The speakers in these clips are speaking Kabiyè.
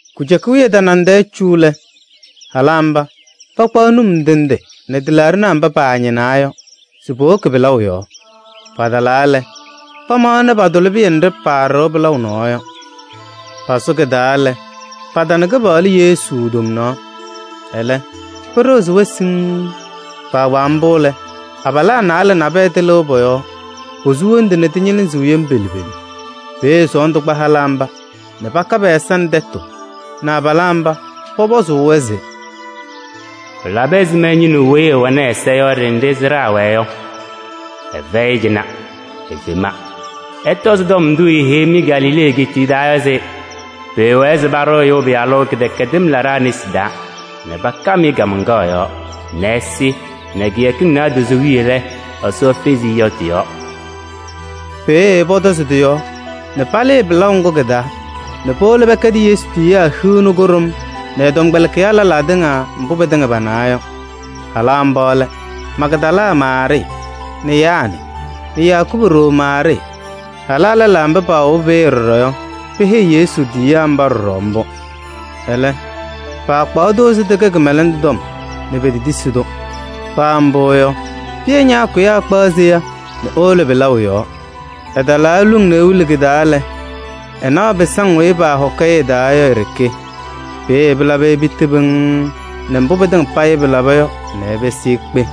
Kujuka wiye tanaŋ tɛɛ cu lɛ, halaa mba pakpaɣ num ndɩ ndɩ nɛ tɩlaaɖɩnaa mba paañɩnaa yɔ se powoki pɩlaʋ yɔɔ. Patalaa lɛ, pamaɣnɩ patʋlɩ pɩyɛ nɖɩ paaɖɩɣ pɩlaʋ nɔɔ yɔ. Pasʋ kɩ-taa lɛ, patana Kɩpaɣlʋ Yesu tomnaɣ. Ɛlɛ, pɩɖɩɣzɩ-wɛ siŋŋ. Kpaagbaa mbʋ lɛ, abalaa naalɛ nabɛyɛ tɩlɩʋ pɔ-yɔɔ. Posu wondu, nɛ tɩñɩlɩzɩɣ pelu pelu. Peeye sɔɔndʋ kpa halaa mba nɛ paka pɛ-ɛza nɛ tɛtʋ nɛ abalaa mba pɔpɔzʋʋ-wɛ se: “Pɩlabɩ ɛzɩma nɛ ɩñɩnɩɣ weyi ɛwɛnɩ ɛ-ɛza yɔ ɖenɖe sɩɖaa wɛɣ yɔ? Ɛfɛyɩ cɩnɛ, efema. Ɩtɔzɩ tɔm ndʋ eeheyi-mɩ Galilee egeetiye taa se: pʋwɛɛ se paɖʋ Ɛyʋ Pɩyalʋ kɩwɛɛkɩm laɖaa nesi taa nɛ pakam-ɩ kaamaŋkaɣ yɔɔ nɛ ɛsɩ nɛ kɩyakɩŋ naadozo wiye lɛ, Ɛsɔ fezi-i yɔ tɩ-yɔɔ.” Peeye pɔtɔzɩ tɩ-yɔɔ nɛ palɩɩ pɩlaʋ ŋgʋ kɩ-taa nɛ powolo pɛkɛdɩ Yesu tiyiyaa hiu nɛ kʋɖʋm nɛ ɛ-tɔmkpɛlɩkɩyaa lɛlaa tɩŋa mbʋ pɩtɩŋa panawa yɔ. Halaa mba lɛ: Magdala Maarɩɩ nɛ Yaanɩ nɛ Yakubu ɖoo Maarɩɩ. Halaa lɛlaa mba paawobi peeye ɖɔɖɔ yɔ, peheyi Yesu tiyiyaa mba ɖɔɖɔ mbʋ. Ɛlɛ, pakpaɣ-tʋ se tɩkɛ kɩmɛlɛndʋ tɔm nɛ petetisi-tʋ. [ Paa mbʋ yɔ, Pɩyɛ ñaakʋyaa ɛkpaɣ seya nɛ ewolo pɩlaʋ yɔɔ. Ɛtalaa eluŋ nɛ ewili kɩ-taa lɛ, ɛnaɣ pɩsaŋ weyi paahɔkɩ-ɩ ɩ-taa yɔ i-ɖeke. Peeye pɩlabɩ-ɩ piti pɩŋŋ nɛ mbʋ pɩtɩŋa payɩ pɩlaba yɔ nɛ ɛpɩsɩ ekpe.]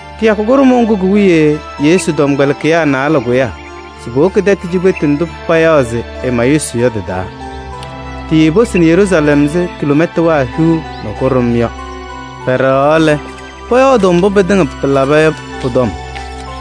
Kɩyakʋ kʋɖʋmʋʋ ŋgʋ ki-wiye Yesu tɔmkpɛlɩkɩyaa naalɛ kʋyaa se powoki tɛtʋ cikpetu ndʋ payaɣ se Emayuusɩ yɔ tɩ-taa. Tiiposini Yeruusalɛm ɛzɩ kiloomɛtanaa hiu nɛ kʋɖʋm yɔ. Pɛɖɛɣaɣ lɛ, pɔyɔɔdʋʋ mbʋ pɩtɩŋa pɩlaba yɔ pʋ-tɔm.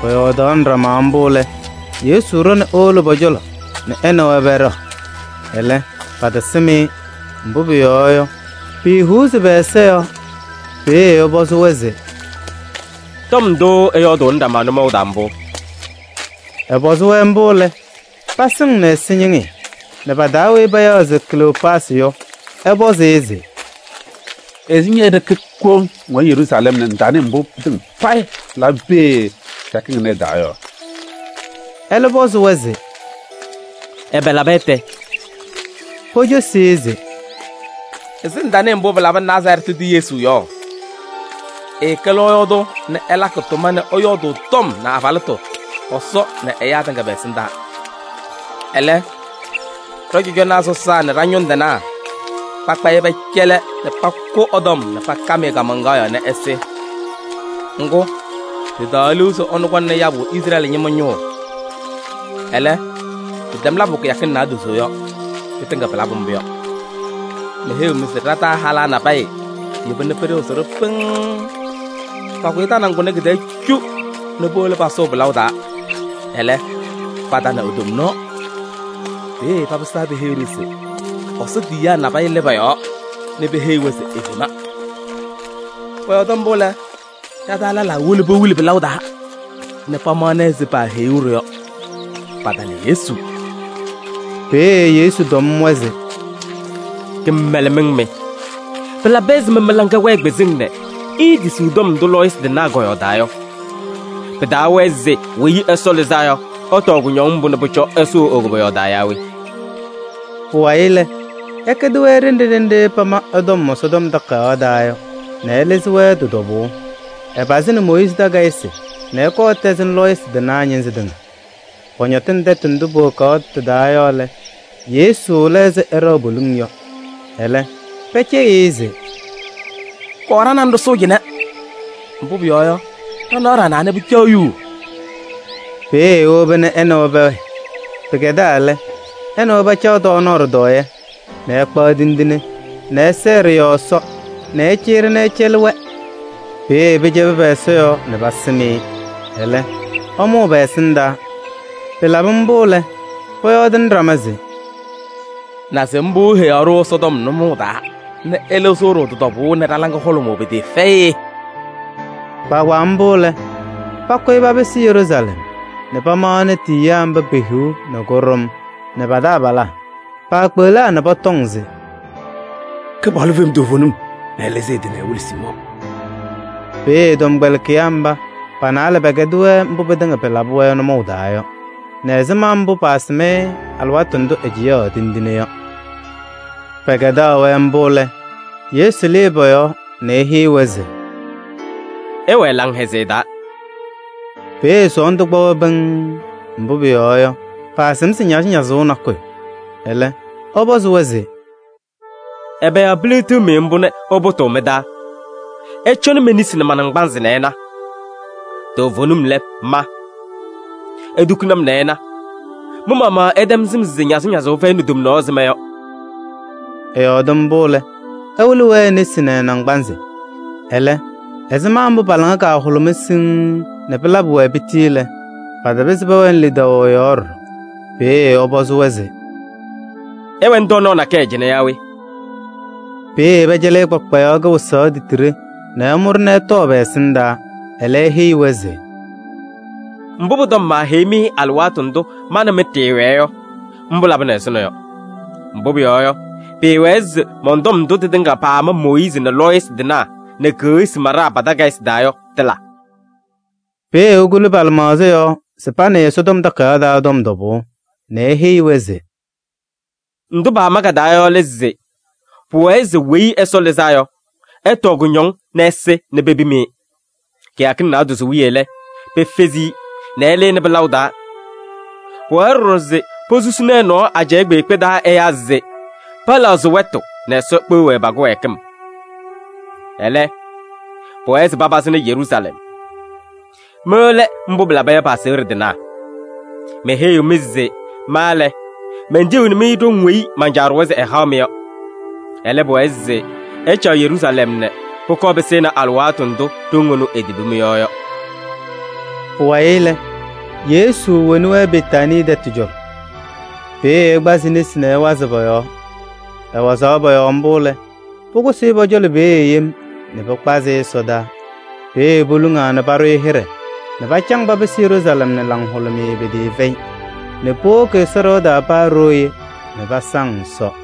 Pɔyɔɔdaɣnɩ ɖama mbʋ lɛ, Yesu ɖɔ nɛ ewolo pɔ-cɔlɔ nɛ ɛ nɛ wɛ pɛɖɛɣ. Ɛlɛ, patasɩm-ɩ, mbʋ pʋyɔɔ yɔ, piihuuzi pɛ-ɛza yɔɔ. Peeye ɛpɔzɩ-wɛ se: “Tɔm ndʋ ɩyɔɔdʋʋnɩ ɖama nʋmɔʋ taa mbʋ?” Ɛpɔzɩ-wɛ mbʋ lɛ, pasɩŋnɩ ɛsɛñɩŋɩyɛ nɛ pa-taa weyi payaɣ se Kleyoopaasɩ yɔ, ɛpɔzɩ-ɩ se: “Ɛzɩ ñe-ɖeke koŋ ŋwɛnɩ Yeruusalɛm nɛ ŋtanɩɩ mbʋ pɩtɩŋa payɩ pɩlabɩ peeye kɩyakɩŋ ɩnɛ ɩ-taa yɔ?” Ɛlɛ ɛpɔzɩ-wɛ se: “Ɛbɛ laba tɛ?” Pocosi-i se: “Ɛzɩ ŋtanɩɩ mbʋ pɩlabɩ Nazarɛɛtɩ tʋ Yesu yɔ? Ɛɛkɛ lɔɔyaɣ tʋ nɛ ɛlakɩ tʋma nɛ ɛyɔɔdʋʋ tɔm nɛ abalɩtʋ Ɛsɔ nɛ ɛyaa tɩŋa pɛ-ɛsɩndaa. Ɛlɛ, ɖɔ-cɔjɔnaa sɔsaa nɛ ɖa-ñʋŋ tɩnaa pakpa-ɩ pɛcɛlɩ nɛ pakʋ ɛ-tɔm nɛ pakam-ɩ kaamaŋkaɣ yɔɔ nɛ ɛsɩ. Ŋgʋ, ɖɩtaɣaɣ liu se ɛnʋ kɔŋnɩ yabʋ Izrɛɛlɩ ñɩma ñʋʋ. Ɛlɛ, pɩtɛm labʋ kɩyakɩŋ naadozo yɔ, pɩtɩŋa pɩlabʋ mbʋ yɔ. Meheyiɣ-mɩ se ɖa-taa halaa nabɛyɛ yeba nɛ pɩɖɩɣzɩ-ɖʋ pɩŋŋ. Pakʋyɩ tanaŋ kʋnɛ kɩ-tɛɛ cu nɛ powolo pasʋʋ pɩlaʋ taa ɛlɛ, patana e-tomnaɣ. Peeye papɩsaa peheyi-ɖʋ se Ɛsɔ tiyiyaa lɩ pɔ-yɔɔ nɛ peheyi-wɛ se efema. Pɔyɔɔdɩ mbʋ lɛ, ɖa-taa lɛlaa wolo pewili pɩlaʋ taa nɛ pamaɣnɩ ɛzɩ paaheyuu-ɖʋ yɔ. Patana Yesu.” Peeye Yesu tɔm-wɛ se: “Kɩmɛlɛmɩŋ mɩ! Pɩlabɩ ɛzɩma mɩ-laŋa wɛɛ kpɩzɩŋ nɛ iitisiɣ tɔm ndʋ lɔɔyɩsɩ tɩnaa kɔyɔɔdaa yɔ? Pɩtaawɛɛ se Weyi Ɛsɔ Lɩzaa Yɔ, ɛtɔɔ kʋñɔŋ mbʋ nɛ pʋcɔ ɛsʋʋ e-koboyaɣ taa yaa we?” Pʋwayɩ lɛ, ɛkɛdɩ-wɛ ɖenɖe ɖenɖe paama ɛ-tɔm Ɛsɔtɔm Takayaɣ taa yɔ nɛ ɛlɩzɩ-wɛ tɩ-tɔbʋʋ. Ɛpazɩnɩ Mooyiizi takayɩsɩ nɛ ɛkɔɔ ɛtɛzɩnɩ lɔɔyɩsɩ tɩnaa ñɩnzɩ tɩŋa. Pɔñɔtɩnɩ tɛtʋ ndʋ powokaɣ ɖɩ-taa yɔ lɛ, Yesu la ɛzɩ ɛɖɛɣ poliŋ yɔ. Ɛlɛ, pɛcɛyɩ-ɩ se: “Kɔɔ ɖa nɛ ŋ ɖɩsʋʋ cɩnɛ. Mbʋ pʋyɔɔ yɔ, ɖanaɣ ɖanaa nɛ pɩcaɣ yuu.” Peeye ewoba nɛ ɛ nɛ wɛ pɛwɛɛ. Pɩkɛdaa lɛ, ɛ nɛ wɛ pacaɣ tɔɔnaɣ ɖɩtɔɔyɛ nɛ ɛkpaɣ tindine nɛ ɛsɛɛ ɖɩ-yɔɔ Ɛsɔ nɛ ɛcɩyɩ-ɖɩ nɛ ɛcɛlɩ-wɛ. Peeye pɩcɛbɩ pɛ-ɛza yɔɔ nɛ pasɩm-ɩ. Ɛlɛ, ɛmʋʋ pɛ-ɛsɩndaa. Pɩlabɩ mbʋ lɛ, pɔyɔɔdɩnɩ ɖama se: “Naze mbʋ eheyaɣ-ɖʋ Ɛsɔtɔm nʋmɔʋ taa nɛ ɛlɩzɩɣ-ɖʋ tɩ-tɔbʋʋ nɛ ɖa-laŋa hʋlʋmʋʋ pɩtɩɩfɛyɩ!” Kpaagbaa mbʋ lɛ, pakʋyɩ papɩsɩ Yeruusalɛm nɛ pamaɣnɩ tiyiyaa mba pe-hiu nɛ kʋɖʋm nɛ pa-taabalaa. Paakpeɣlaa nɛ pɔtɔŋ se: “Kɩpaɣlʋ fema toovenim nɛ ɛlɩzɩ ɛ-tɩ ɛwɩlɩ Siimɔɔ.” Peeye ɛ-tɔmkpɛlɩkɩyaa mba pa-naalɛ pɛkɛdɩ-wɛ mbʋ pɩtɩŋa pɩlabɩ-wɛ nʋmɔʋ taa yɔ, nɛ ɛzɩma mbʋ paasɩm-ɩ alɩwaatʋ ndʋ ɛcɩyaɣ tindine yɔ. Pɛkɛdaɣ-wɛ mbʋ lɛ, Yesu lɩɩ pɔ-yɔɔ [nɛ eheyi-wɛ se: “Ɩwɛɛ laŋhɛzɩyɛ taa.”] Peeye sɔɔndʋ kpa-wɛ pɩŋŋ, mbʋ pʋyɔɔ yɔ, paasɩm se ñazɩñazʋʋ nakʋyʋ. Ɛlɛ, ɛ-pɔzɩ-wɛ se: “Ɛbɛ yɔɔ piliɣtiɣ-mɩ mbʋ nɛ ɩpʋtʋʋ mɩ-taa? Ɩcɔnɩ me-nesi nɛ ma-naŋgbanzɩ nɛ ɩna. Toovenim lɛ, ma! Itukuni-m nɛ ɩna, mɩ-maɣmaɣ ɩtɛm sɩm se ñazɩñazʋʋ fɛyɩnɩ tomnaɣ ɛzɩ ma yɔ.” [ Ɛyɔɔdɩ mbʋ lɛ, ɛwɩlɩ-wɛ e-nesi nɛ ɛ-naŋgbanzɩ.] Ɛlɛ ɛzɩma mbʋ pa-laŋa kahʋlʋmaa siŋŋ nɛ pɩlabɩ-wɛ piti lɛ, patapɩzɩ pɛwɛnɩ lidaʋ ɛ-yɔɔ ɖɔɖɔ. Peeye ɛpɔzɩ-wɛ se: “Ɩwɛnɩ tɔɔnaɣ nakɛyɛ cɩnɛ yaa we?” Peeye pɛcɛlɩ-ɩ kpakpayaɣ kɩwɩsaɣ titiɖe nɛ ɛmʋ-ɖɩ ɛtɔɔ pɛ-ɛsɩndaa. Ɛlɛ eheyi-wɛ se: “Mbʋ pʋ-tɔm maaheyi-mɩ alɩwaatʋ ndʋ ma nɛ mɩ ɖɩɩwɛɛ yɔ, mbʋ labɩnɩ ɛzʋnɔ yɔ. Mbʋ pʋyɔɔ yɔ, pɩɩwɛɛ se mɔn-tɔm ndʋ tɩtɩŋa paama Mooyiizi nɛ lɔɔyɩsɩ tɩnaa nɛ keɣsi maɖaa pa-takayɩsɩ taa yɔ, tɩla.” Peeye ekuli pa-lɩmaɣza yɔɔ se panɩɩ Ɛsɔtɔm Takayaɣ taa tɔm tɔbʋʋ nɛ eheyi-wɛ se: “Ndʋ pama ka-taa yɔ lɛ se pʋwɛɛ se Weyi Ɛsɔ Lɩzaa Yɔ, ɛtɔɔ kʋñɔŋ nɛ ɛsɩ nɛ pepim-i. Kɩyakɩŋ naadozo wiye lɛ, pefezi-i nɛ ɛlɩnɩ pɩlaʋ taa. Pʋwɛɛ ɖɔɖɔ se posusini ɛ-nɔɔ ajɛɛ kpeekpe taa ɛyaa se pɛlɛɣzɩ wɛtʋ nɛ Ɛsɔ kpeɣ-wɛ pa-kɩwɛɛkɩm. Ɛlɛ, pʋwɛɛ se papazɩnɩ Yeruusalɛm. Mɩ lɛ mbʋ pɩlaba yɔ pɩ-aseɣɖe tɩnaa. Meheyiɣ-mɩ se ma lɛ, mentiyiɣni-mɩ ɖoŋ weyi man-Caa ɖʋwa se ɛhaɣ-mɩ yɔ. Ɛlɛ, pʋwɛɛ se ɩcaɣ Yeruusalɛm nɛ pʋkɔɔ pɩsɩnɩ alɩwaatʋ ndʋ ɖoŋ ɛnʋ etibi mɩ-yɔɔ yɔ.” Pʋwayɩ lɛ, Yesu woni-wɛ Betaanii tɛtʋ cɔlɔ. Peeye ɛkpazɩ e-nesi nɛ ɛwazɩɣ pɔ-yɔɔ. Ɛwazaɣ pɔ-yɔɔ mbʋ lɛ, pʋkʋsɩ-ɩ pɔ-cɔlɔ peeye yem nɛ pɩkpazɩ-ɩ ɛsɔdaa. Peeye poluŋaa nɛ paɖʋ-ɩ hɩɖɛ nɛ pacaŋ papɩsɩ Yeruusalɛm nɛ laŋhʋlʋmɩyɛ pɩtɩɩfɛyɩ nɛ powoki Ɛsɔ ɖɩɣa taa paa ɖooye nɛ pasaŋ Ɛsɔ.